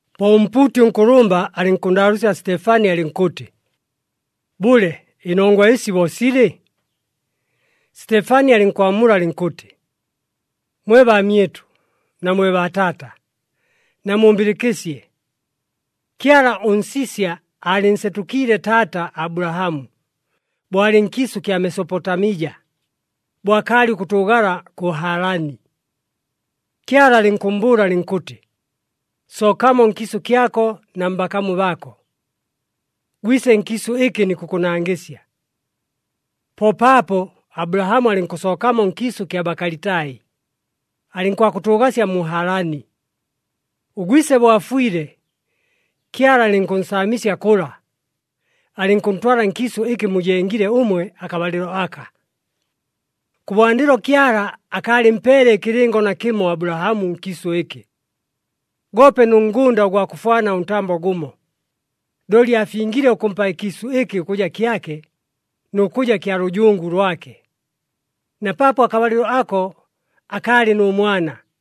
Po ʉmpuuti ʉnkʉlʉmba alɨnkʉnndaalʉʉsya Sitefani alɨnkʉtɨ, “Bʉle, ɨnongwa ɨsi bo silɨ?” Sitefani alɨnkwamula alɨnkʉtɨ, “Mwe baamyɨtʉ na mwe baataata, namumbɨlɨkɨsye! Kyala ʉNsisya aalɨnsetʉkiile taata Abulahamu bo alɨ nkiisʉ kya Mesopotamija, bo akaalɨ ʉkʉtʉʉgala kʉ Halani. Kyala alɨnkʉmmbʉʉla alɨnkʉtɨ, ‘Sookamo nkiisʉ kyako na mbakamu baako, gwise nkiisʉ ɨkɨ nikʉkʉnangɨsya.’ Po paapo Abulahamu alɨnkʉsookamo nkiisʉ kya Bakalitai, alɨnkwakʉtʉʉgasya mu Halani. Ʉgwise bo afwile, Kyala alɨnkʉnsaamisya kʉla, alɨnkʉntwala nkiisʉ ɨkɨ mujengile ʉmwe akabalɨlo aka. “Kʉbwandɨlo Kyala akaalɨmpeele ɨkɨlɨngo nakɨmo Abulahamu nkiisʉ ɨkɨ, goope nʉ ngʉnda ʉgwa kʉfwana ʉntambo gʉmo. Looli aafingile ʉkʉmpa ɨkiisʉ ɨkɨ ʉkʉja kyake nʉ kʉja kya lʉjungu lwake, na paapo akabalɨlo ako akaalɨ nʉ mwana.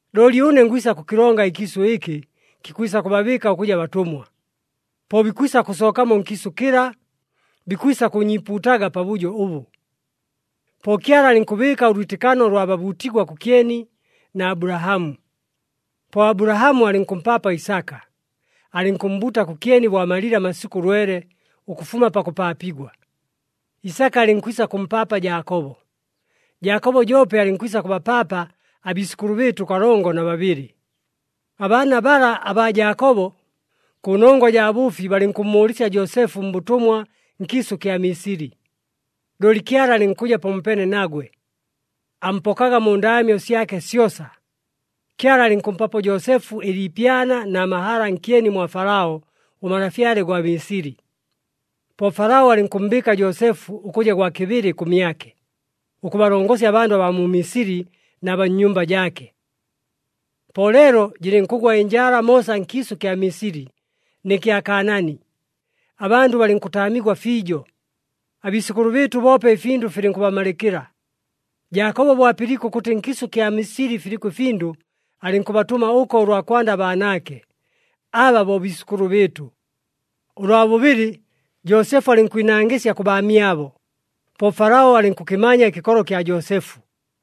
Looli ʉne ngwisa kʉkɨlonga ɨkiisʉ ɨkɨ kikwisa kʉbabɨɨka ʉkʉja batʉmwa. Po bikwisa kʉsookamo nkiisʉ kɨla, bikwisa kʉʉnyiipuutaga pabʉjo ʉbʉ.’ Po Kyala alɨnkʉbɨɨka ʉlwitɨkano ʉlwa bʉbuutigwa kʉkyeni na Abulahamu. Po Abulahamu alɨnkʉmpaapa Isaka, alɨnkʉmmbuuta kʉkyeni bo amalile amasikʉ lwele ʉkʉfuma pakʉpaapigwa. Isaka alɨnkwisa kʉmpaapa Jaakobo, Jaakobo joope alɨnkwisa kʉbapaapa abiisʉkʉlʉ bɨɨtʉ kalongo na babɨlɨ. “Abaana bala abaa Jaakobo, kʉnongwa jaa bʉʉfi balɨnkʉmmʉʉlɨsya Joosefu mbʉtʉmwa nkiisʉ kya Misili. Looli Kyala alɨnkʉja pamopeene nagwe, ampokaga mu ndaamyo syake syosa. Kyala alɨnkʉmpapo Joosefu ɨliipyana na mahala nkyeni mwa Falao ʉmalafyale gwa Misili. Po Falao alɨnkʉmmbɨɨka Joosefu ʉkʉja gwa kɨbɨlɨ kʉmyake, ʉkʉbalongosya abandʉ abaa mu Misili na baa nnyumba jaake. “Po leelo jɨlɨnkʉgwa ɨnjala moosa nkiisʉ kya Misili nɨ kya Kaanaani, abandʉ balɨnkʉtaamigwa fiijo. Abiisʉkʉlʉ bɨɨtʉ boope ɨfindʉ filɨnkʉbamalɨkɨla. Jaakobo bo apɨliike ʉkʉtɨ nkiisʉ ɨkya Misili filiko ɨfindʉ, alɨnkʉbatʉma ʉko ʉlwa kwanda abaanaake, aba bo biisʉkʉlʉ bɨɨtʉ. Ʉlwa bʉbɨlɨ Joosefu alɨnkwinangɨsya kʉ baamyabo, po Falao alɨnkʉkɨmanya ɨkɨkolo kya Joosefu.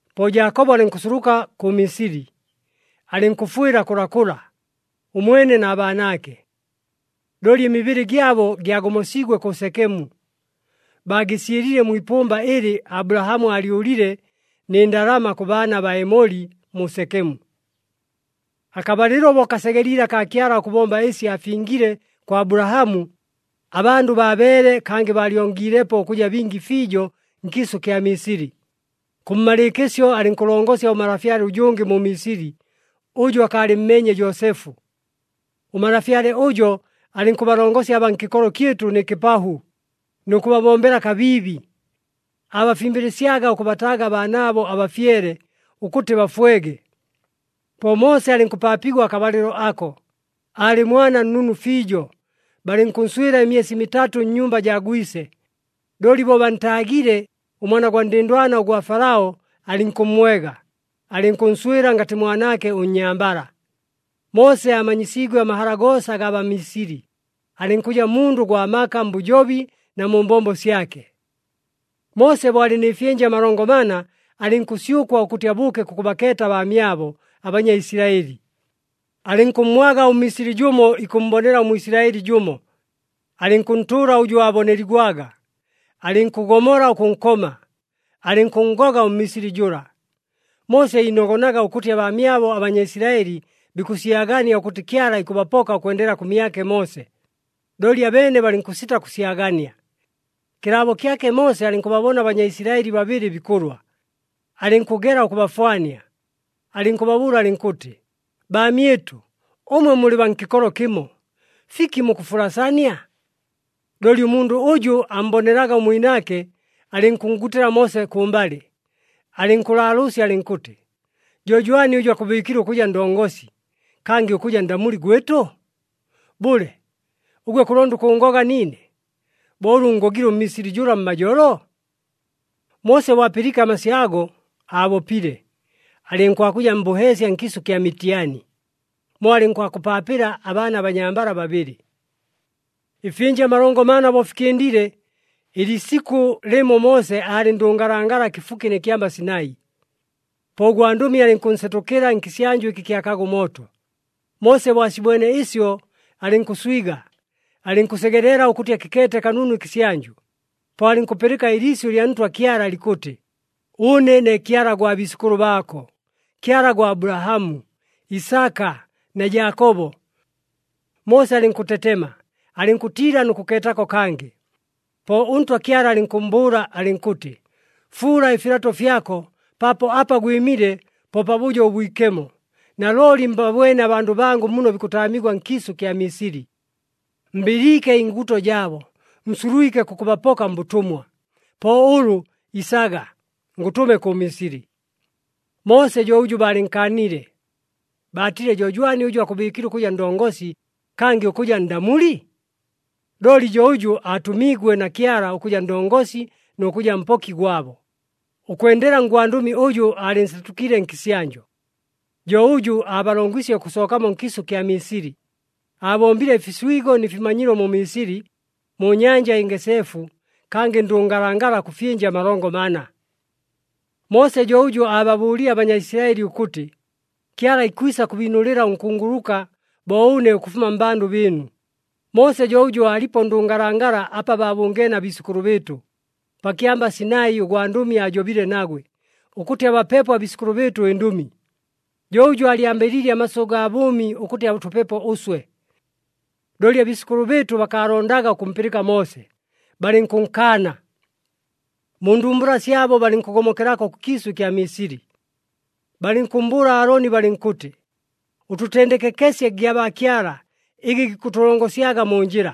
Po Jaakobo alɨnkʉnsuluka kʉ Misili, alɨnkʉfwɨla kʉlakʉla, ʉmwene na baanaake. Looli ɨmibɨlɨ gyabo gyagomosiigwe kʉ Sekemu, baagɨsyɨlile mwi ipʉmba ɨlɨ Abulahamu aalyʉlile nɨ ndalama kʉ baana baa Emoli mu Sekemu. “Akabalɨlo bo kasegeliile akaa Kyala ʉkʉbomba ɨsi aafingile kwa Abulahamu, abandʉ baabeele kangɨ baalyongilepo ʉkʉja bingi fiijo nkiisʉ kya Misili. Kʉmmalɨɨkɨsyo, alɨnkʉlongosya ʉmalafyale ʉjʉngɨ mu Misili, ʉjʉ akaalɨmmeenye Joosefu. Ʉmalafyale ʉjo alɨnkʉbalongosya abaa nkɨkolo kyɨtʉ nɨ kɨpahʉ nʉ kʉbabombela kabiibi. Aabafimbɨlɨsyaga ʉkʉbataaga abaanaabo abafyele, ʉkʉtɨ bafwege. “Po Moose alɨnkʉpaapigwa akabalɨlo ako, aalɨ mwana nnunu fiijo. Balɨnkʉnswɨla ɨmyesi mitatʉ nnyumba jaa gwise. Looli bo bantaagile, ʉmwana ʉndɨndwana ʉgwa Falao alɨnkʉmmwega, alɨnkʉnswɨla ngatɨ mwanaake ʉnnyambala. Moose aamanyisiigwe amahala goosa agaa Bamisili, alɨnkʉja mundʉ gwa maka mbʉjobi na mu mbombo syake. “Moose bo aalɨ nɨ fyɨnja amalongo mana, alɨnkʉsyʉkwa ʉkʉtɨ abʉʉke kʉkʉbakeeta abaamyabo aBanyaisilaɨli. Alɨnkʉmmwaga ʉMmisili jʉmo ikʉmmbonela ʉMwisilaɨli jʉmo, alɨnkʉntʉʉla ʉjʉ aaboneligwaga, alɨnkʉgomola ʉkʉnkoma, alɨnkʉnngoga ʉMmisili jʉla. Moose iinogonaga ʉkʉtɨ abaamyabo aBanyaisilaɨli bikʉsyagania ʉkʉtɨ Kyala ikʉbapoka ʉkwendela kʉmyake Moose, looli abeene balɨnkʉsita kʉsyagania. Kɨlaabo kyake, Moose alɨnkʉbabona aBanyaisilaɨli babɨlɨ bikʉlwa. Alɨnkʉgela ʉkʉbafwania, alɨnkʉbabʉʉla alɨnkʉtɨ, ‘Baamyɨtʉ, ʉmwe mulɨ baa nkɨkolo kɨmo! Fiki mukʉfulasania?’ Looli ʉmundʉ ʉjʉ ammbonelaga ʉmwinaake alɨnkʉnngutɨla Moose kʉmbalɨ, alɨnkʉlaalʉʉsya alɨnkʉtɨ, ‘Jo jwani ʉjʉ akʉbɨɨkile ʉkʉja ndongosi, kangɨ ʉkʉja ndamuli gwɨtʉ? Bʉle, ʉgwe kʉlonda ʉkʉʉngoga niine, bo ʉlʉ ʉnngogile ʉMmisili jʉla mmajolo?’ Moose bo apɨliike amasyʉ ago aabopile, alɨnkwakʉja mbʉheesya nkiisʉ kya Mitiani, mo alɨnkwakʉpaapɨla abaana abanyambala babɨlɨ. “Ɨfyɨnja amalongo mana bo fikɨndile, ɨliisikʉ lɨmo Moose aalɨ ndʉngalangala kɨfuki nɨ kyamba Sinai. Po ʉgwandʉmi alɨnkʉnsetʉkɨla nkɨsyanjʉ ɨkɨ kyakaga ʉmooto. Moose bo asibwene ɨsyo, alɨnkʉswiga, alɨnkʉsegelela ʉkʉtɨ akɨkeete kanunu ɨkɨsyanjʉ. Po alɨnkʉpɨlɨka ɨliisyʉ lya Ntwa Kyala likʉtɨ, ‘Ʉne ne Kyala gwa biisʉkʉlʉ baako, Kyala gwa Abulahamu, Isaka na Jaakobo.’ Moose alɨnkʉtetema, alɨnkʉtiila nʉ kʉkeetako kangɨ. “Po ʉNtwa Kyala alɨnkʉmmbʉʉla alɨnkʉtɨ, ‘Fuula ɨfilato fyako, paapo apa gwɨmile po pabʉjo ʉbwikemo. Nalooli mbabwene abandʉ bangʉ muno bikʉtaamigwa nkiisʉ kya Misili. Mbɨliike ɨnguuto jaabo, nsulwike kʉkʉbapoka mbʉtʉmwa. Po ʉlʉ isaga, ngʉtʉme kʉ Misili.’ “Moose jo ʉjʉ baalɨnkaanile. Baatile, ‘Jo jwani ʉjʉ akʉbɨɨkile ʉkʉja ndongosi, kangɨ ʉkʉja ndamuli?’ Looli jo ʉjʉ aatʉmiigwe na Kyala ʉkʉja ndongosi nʉ kʉja mpoki gwabo, ʉkwendela ngwandʉmi ʉjʉ aalɨnsetʉkiile nkɨsyanjʉ. Jo ʉjʉ aabalongwisye ʉkʉsookamo nkiisʉ kya Misili. Aabombile ɨfiswigo nɨ fimanyilo mu Misili, mu Nyanja ɨNgeseefu, kangɨ ndʉngalangala kʉ fyɨnja amalongo mana. “Moose jo ʉjʉ aababʉʉlile aBanyaisilaɨli ʉkʉtɨ, ‘Kyala ikwisa kʉbiinʉlɨla ʉnkunguluka bo ʉne ʉkʉfuma mmbandʉ bɨɨnu.’ Moose jo ʉjʉ aalipo ndʉngalangala apa baabʉngeene abiisʉkʉlʉ bɨɨtʉ. Pa kyamba Sinai ʉgwandʉmi aajobile nagwe, ʉkʉtɨ abapepo abiisʉkʉlʉ bɨɨtʉ ɨndʉmi. Jo ʉjʉ aalyambɨliile amasyʉ gaa bʉʉmi ʉkʉtɨ atʉpepo ʉswe. “Looli abiisʉkʉlʉ bɨɨtʉ bakaalondaga ʉkʉmpɨlɨka Moose, balɨnkʉnkaana. Mu ndumbula syabo balɨnkʉgomokelako kʉkiisʉ ɨkya Misili. Balɨnkʉmmbʉʉla Aaloni balɨnkʉtɨ, ‘Ʉtʉtendekekesye gyabaakyala ɨgɨ gikʉtʉlongosyaga mu njɨla.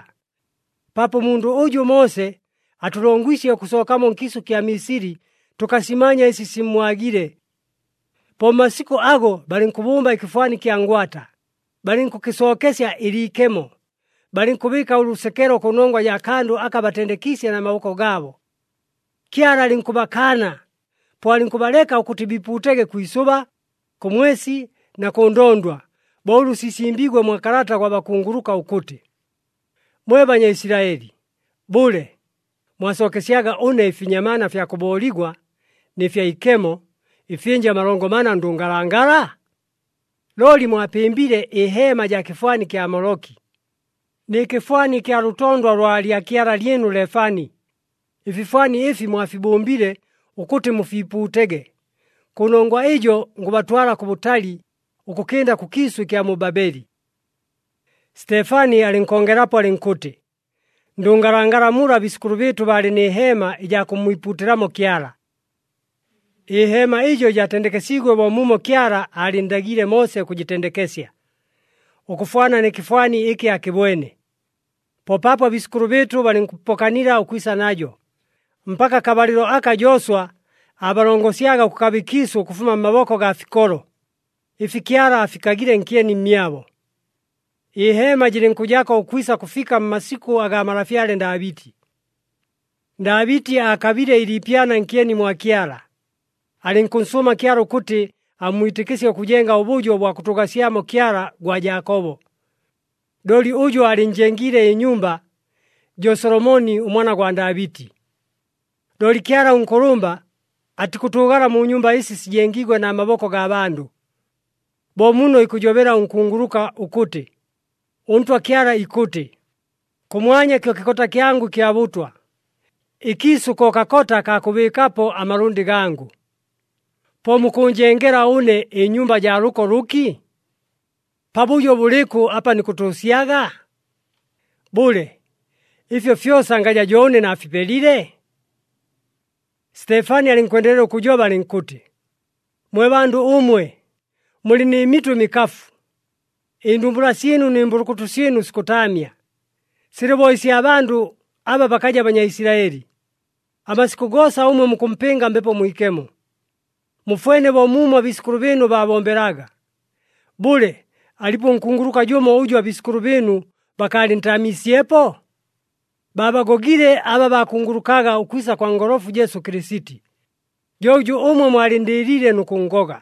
Paapo ʉmundʉ ʉjʉ Moose, atʉlongwisye ʉkʉsookamo nkiisʉ kya Misili, tʉkasimanya ɨsi simmwagile!’ Po mmasikʉ ago balɨnkʉbʉmba ɨkɨfwani kya ngwata, balɨnkʉkɨsookesya ɨliikemo, balɨnkʉbɨɨka ʉlʉsekelo kʉnongwa jaa kandʉ aka batendekiisye na maboko gaabo. Kyala alɨnkʉbakaana, po alɨnkʉbaleka ʉkʉtɨ biipuutege kwi isʉba, kʉ mwesi na kʉ ndondwa, bo ʉlʉ sisimbiigwe mwa kalata gwa bakunguluka ʉkʉtɨ, ‘Mwe Banyaisilaɨli, bʉle, mwasookesyaga ʉne ɨfinyamaana fya kʉbooligwa nɨ fya ikemo, ɨfyɨnja amalongo mana ndʉngalangala? Looli mwapɨmbile ɨheema jaa kɨfwani kya Moloki, nɨ kɨfwani ɨkya lʉtondwa lwa lyakyala lyɨnu Lefani, ɨfifwani ɨfi mwafibʉmbile ʉkʉtɨ mufiipuutege. Kʉnongwa ɨjo ngʉbatwala kʉbʉtali ʉkʉkɨnda kʉkiisʉ ɨkya mu Babeli.’” Sitefani alɨnkongelapo alɨnkʉtɨ, “Ndʉngalangala mula abiisʉkʉlʉ bɨɨtʉ baalɨ nɨ heema ɨjaa kʉmmwipuutɨlamo Kyala. Ɨheema ɨjo jaatendekesiigwe bo muumo Kyala aalɨnndagiile Moose ʉkʉjɨtendekesya, ʉkʉfwana nɨ kɨfwani ɨkɨ aakɨbwene. Po paapo abiisʉkʉlʉ bɨɨtʉ balɨnkʉpokanila ʉkwisa najo, mpaka akabalɨlo aka Jooswa aabalongosyaga ʉkʉkaba ɨkiisʉ ʉkʉfuma mmaboko gaa fikolo, ɨfi Kyala aafikagile nkyeni mmyabo. Ɨheema jɨlɨnkʉjako ʉkwisa kʉfika mmasikʉ agaa malafyale Ndaabɨti. “Ndaabɨti aakabile ɨliipyana nkyeni mwa Kyala, alɨnkʉnsʉʉma Kyala ʉkʉtɨ ammwitɨkɨsye ʉkʉjenga ʉbʉjo bwa kʉtʉʉgasyamo Kyala gwa Jaakobo. Looli ʉjʉ aalɨnnjengiile ɨnyumba, jo Solomoni ʉmwana gwa Ndaabɨti. Looli Kyala ʉNkʉlʉmba, atikʉtʉʉgala mu nyumba ɨsi sijengiigwe na maboko gaa bandʉ. Bo muno ikʉjobela ʉnkunguluka ʉkʉtɨ, ‘ɄNtwa Kyala ikʉtɨ, “Kʉmwanya kyo kɨkota kyangʉ ɨkya bʉtwa, ɨkiisʉ ko kakota kaa kʉbɨɨkapo amalʉndɨ gangʉ. Po mukʉʉnjengela ʉne ɨnyumba jaa lʉko lʉki? Pabʉjo bʉlɨkʉ apa nikʉtʉʉsyaga? Bʉle, ɨfyo fyosa ngaja jo ʉne naafipelile?”’” Sitefani alɨnkwendelela ʉkʉjoba alɨnkʉtɨ, “Mwe bandʉ ʉmwe mulɨ nɨ mitʉ ɨmikafu! Ɨndumbula syɨnu nɨ mbʉlʉkʉtʉ syɨnu sikʉtaamya, silɨ bo ɨsya bandʉ aba bakaja Banyaisilaɨli. Amasikʉ goosa ʉmwe mukʉmpɨnga Mbepo Mwikemo, mufwene bo muumo abiisʉkʉlʉ bɨɨnu baabombelaga! Bʉle, alipo ʉnkunguluka jʉmo ʉjʉ abiisʉkʉlʉ bɨɨnu bakaalɨntaamiisyepo? Baabagogile aba baakungulukaga ʉkwisa kwa Ngolofu, Jesu Kɨlɨsiti! Jo ʉjʉ ʉmwe mwalɨnndɨɨliile nʉ kʉnngoga.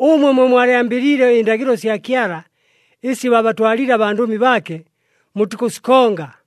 Ʉmwe mwe mwalyambɨliile ɨndagɨlo sya Kyala ɨsi baabatwaliile abandʉmi baake, mutikʉsikonga.”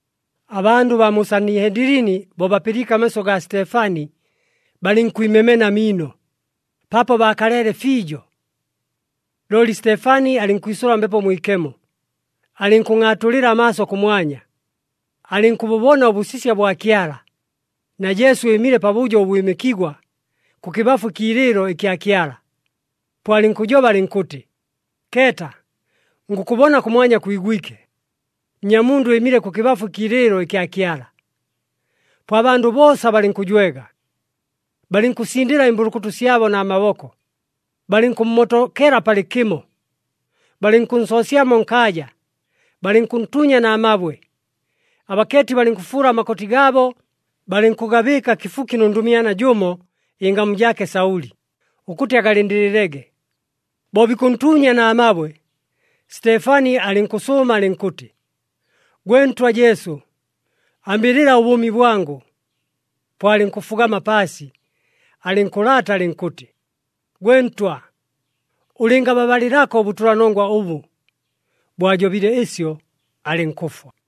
Abandʉ baa mu Sanihendilini, bo bapɨliike amasyʉ gaa Sitefani, balɨnkwimemena amiino, paapo baakaleele fiijo. Looli Sitefani alɨnkwisʉla Mbepo Mwikemo, alɨnkʉngʼaatulɨla amaaso kʉmwanya, alɨnkʉbʉbona ʉbʉsisya bwa Kyala, na Jesu ɨɨmile pabʉjo ʉbwɨmɨkigwa, kʉkɨbafu ɨkiilɨɨlo ɨkya Kyala. Po alɨnkʉjoba alɨnkʉtɨ, “Keeta! Ngʉkʉbona kʉmwanya kwigwike, Nnyamundʉ ɨɨmile kʉkɨbafu ɨkiilɨɨlo ɨkya Kyala!” Po abandʉ boosa balɨnkʉjwega, balɨnkʉsindɨla ɨmbʉlʉkʉtʉ syabo na maboko, balɨnkʉmmotokela palɨkɨmo, balɨnkʉnsoosyamo nkaaja, balɨnkʉntuunya na mabwe. Abakeeti balɨnkʉfuula amakoti gaabo, balɨnkʉgabɨɨka kɨfuki nʉ ndʉmyana jʉmo, ɨngamu jaake Saʉli, ʉkʉtɨ agalɨndɨlɨlege. Bo bikʉntuunya na mabwe, Sitefani alɨnkʉsʉʉma alɨnkʉtɨ, “Gwe Ntwa Jesu, ambɨlɨla ʉbʉʉmi bwangʉ!” Po alɨnkʉfugama paasi, alɨnkʉlaata alɨnkʉtɨ, “Gwe Ntwa, ʉlɨngababalɨlako ʉbʉtʉlanongwa ʉbʉ.” Bo ajobile ɨsyo, alɨnkʉfwa.